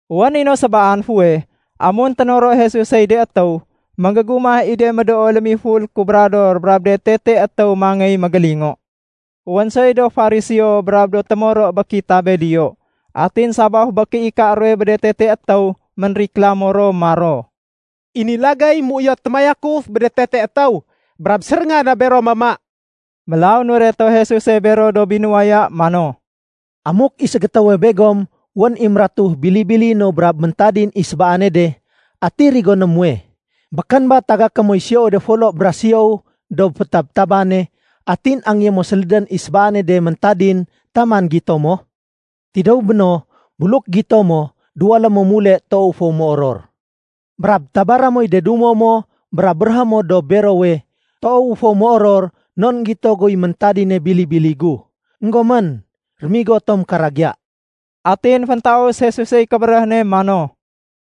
Wén i no sébaan fuweh, amun ténoro Jesusey de étéw, ménggégumah i de médoo lémiful kubrador brab de tete étéw mangéy mégélingo. Wén soy do Fariseo brab do témoro bé kitabé diyo. Atin sabaf bé kéika ruwe bé de tete étéw, ménriklamo ro maro, “I ni lagéy méuyot témayakuf bé de tete étéw brab séréngan na bero mama.” Mélaw nureto Jesuse bero do binuwaya mano, “Amuk i ségétéwe begom wén i mératu bili-bili no brab méntadin i sébaane de, ati rigoné muwe? Békén ba tagaké moy siyowe de folo bra siyow dob fétabtabane, atin angéyé mo sélédén i sébaane de méntadin taman gito mo? Tidéw béno, buluk gito mo, duwalé mo mule toow fo méoror. Brab tabaré moy de dumo mo brab béréhé mo dob berowe, ‘Toowu fo méoror non énggito guy méntadine bili-bili gu. Enggomén, rémigo tom karagiya.’” Atin féntaus Jesusey kébéréh ne mano,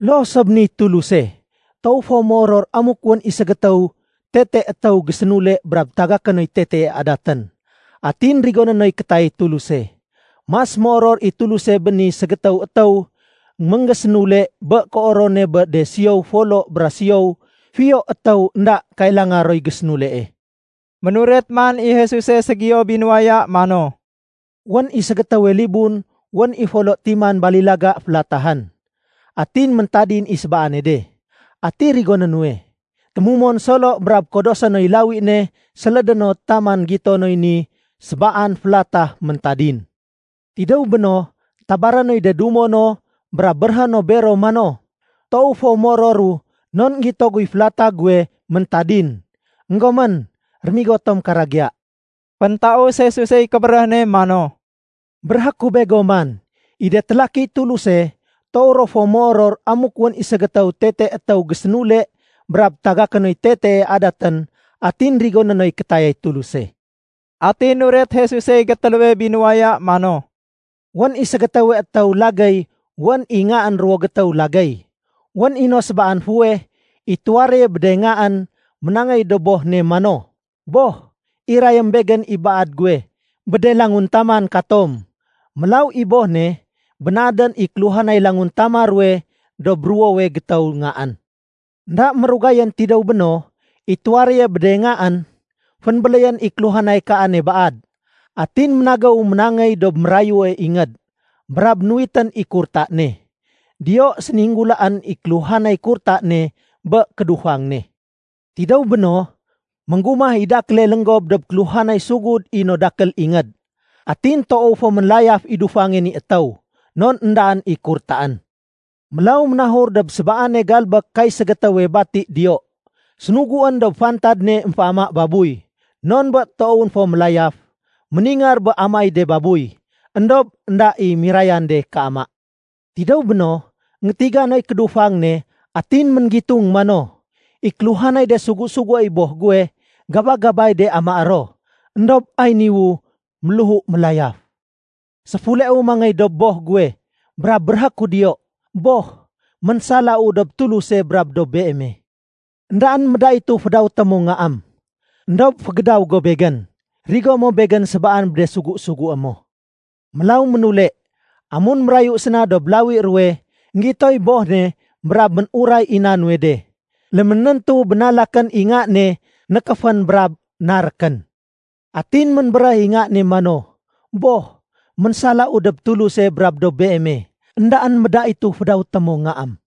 “Loo so bé niy Tuluse. Toow fo méoror amuk wén i ségétéw tete étéw gésénule brab tagaké noy tetee adatén, atin rigoné noy kétayay Tuluse. Mas méoror i Tuluse bé ni ségétéw étéw ménggésénule bé kéoror ne bé de siyow folo bra siyow fiyo étéw énda kailanga roy gésénulee.” Ménuret man i Jesuse ségiyo binuwaya mano, “Wén i ségétéwe libun wén i folo timan balilaga félatahén. Atin méntadin i sébaane de. Ati rigoné nuwe? Témumon solo brab kodosé noy lawi ne sélédé no taman gito noy ni sébaan félata méntadin. Tidéw béno, tabaré noy de dumo no brab béréhé no bero mano, ‘Toow fo méororu non énggito guy félata guwe méntadin. Enggomén, rémigo tom karagiya.’” Féntaus Jesusey kébéréh ne mano, “Béréhé ku begom man, i de télakiy Tuluse toow ro fo méoror amuk wén i ségétéw tete étéw gésénule brab tagaké noy tetee adatén atin rigoné noy kétayay Tuluse.” Atin nuret Jesusey gétéléwe binuwaya mano, “Wén i ségétéwe étéw lagéy wén i ngaén ruwo gétéw lagéy. Wén i no sébaan fuweh i tuwaréye bé de ngaén ménangéy dob boh ne mano, ‘Boh, irayém begén i baad guwe bé de languntaman katom.’ Mélaw i boh ne bénaadén i kéluhanay languntama ruwe dob ruwowe gétéw ngaén. Enda mérugayén tidéw béno, i tuwaréye bé de ngaén fénbéléyén i kéluhanay kaane baad. Atin ménagéw ménangéy dob mérayue ingéd, brab nuwitén i kurta ne. Diyo séninggulaén i kéluhanay kurta ne bé kédufang ne. Tidéw béno, ménggumah i dakéle lénggob dob kéluhanay sugud i no dakél ingéd. Atin toow fo mélayaf i dufange ni étéw, non éndaén i kurtaén. Mélaw ménahur dob sébaane galbék kay ségétéwe bati diyo. Sénuguén dob fantad ne émféama babuy. Non bé toowén fo mélayaf, méningar bé amaéy de babuy. Endob énda i mirayan de kéama. Tidéw béno, énggétiga noy kédufang ne atin ménggitung mano, ‘I kéluhanay de sugu-suguéy boh guwe, gaba-gabay de amaé ro. Endob ay niwu méléhu mélayaf. Séfuleu mangéy dob boh guwe brab béréhé ku diyo, Boh, ménsalau dob Tuluse brab dob beeme. Endaén médaitu fédawété mo ngaém. Endob fégédaw go begén. Rigo mo begén sébaan bé de sugu-sugué mo.’” “Mélaw ménule. Amun mérayu séna dob lawi ruwe, énggitoy boh ne brab mén-uray i éna nuwe de. Léménéntu bénalakén i nga ne nékéfén brab narékén. Atin ménbéréh i nga ne mano, ‘Boh, ménsalau dob Tuluse brab dob beeme. Endaén médaitu fédawéto mo ngaém.’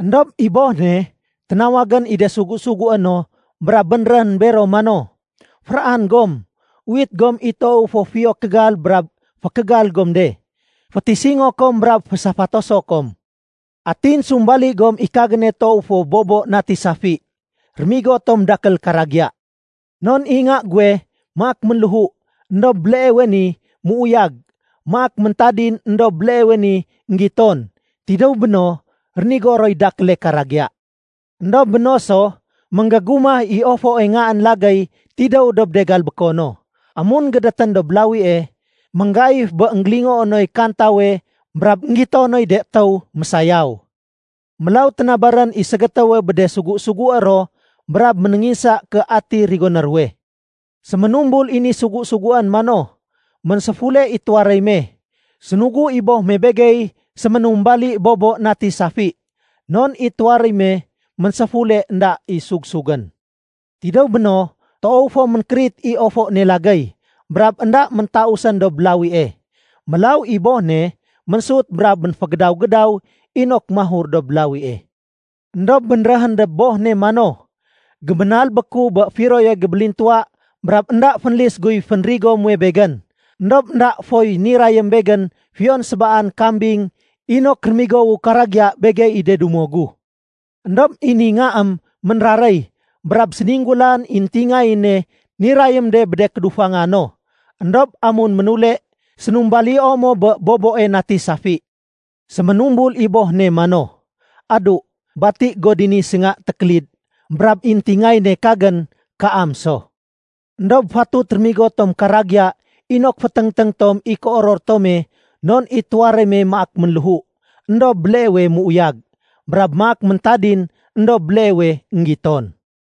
Endob i boh ne ténawagén i de sugu-sugué no brab bénréhén bero mano, ‘Féraan gom. Uwit gom i toowe fo fiyo kégal brab fékégal gom de. Fétisingo kom brab fésafatoso kom. Atin sumbali gom i kagéne toow fo bobo nati safi. Rémigo tom dakél karagiya. Non i nga guwe maak ménléhu, éndob béleewe ni méuyag. Maak méntadin, éndob béleewe ni énggiton.’ Tidéw béno, rénigo roy dakéle karagiya. “Endob béno so, ménggégumah i ofoe ngaén lagéy tidéw dob de galbéko no. Amun gédétén dob lawie, ménggaif bé énggélingoo noy kantawe brab énggito noy de étéw mésayaw. Mélaw ténabarén i ségétéwe bé de sugu-sugué ro brab ménénginsa ké ati rigoné ruwe. Séménumbul i ni sugu-suguén mano, ‘Ménséfule i tuwaréy me. Sénugu i boh me begey séménumbali bobo nati safi, non i tuwaréy me ménséfule énda i sugsugén.’ Tidéw béno, toow fo ménkérit i ofo ne lagéy, brab énda méntausén dob lawie. Mélaw i boh ne ménsut brab ménfégédaw-gédaw inok mahur dob lawie. Endob bénréhén dob boh ne mano, ‘Géménalbéku bé firoye gébélintuwa brab énda fénlis guy fénrigo muwe begén. Endob énda foy nirayém begén fiyon sébaan kambing inok rémigowu karagiya begey i de dumo gu. Endob i ni ngaém ménraréy, brab séninggulaén i éntingayéne nirayém de bé de kédufanga no. Endob amun ménule, sénumbalio mo bé boboe nati safi.’ Séménumbul i boh ne mano, ‘Adu, bati go dini sénga tékélid brab i éntingayéne kagén, kaam so. Endob fatut rémigo tom karagiya inok féténgténg tom i kéoror tome non i tuwaréy me maak ménléhu, éndob béleewe méuyag. Brab maak méntadin, éndob béleewe énggiton.’”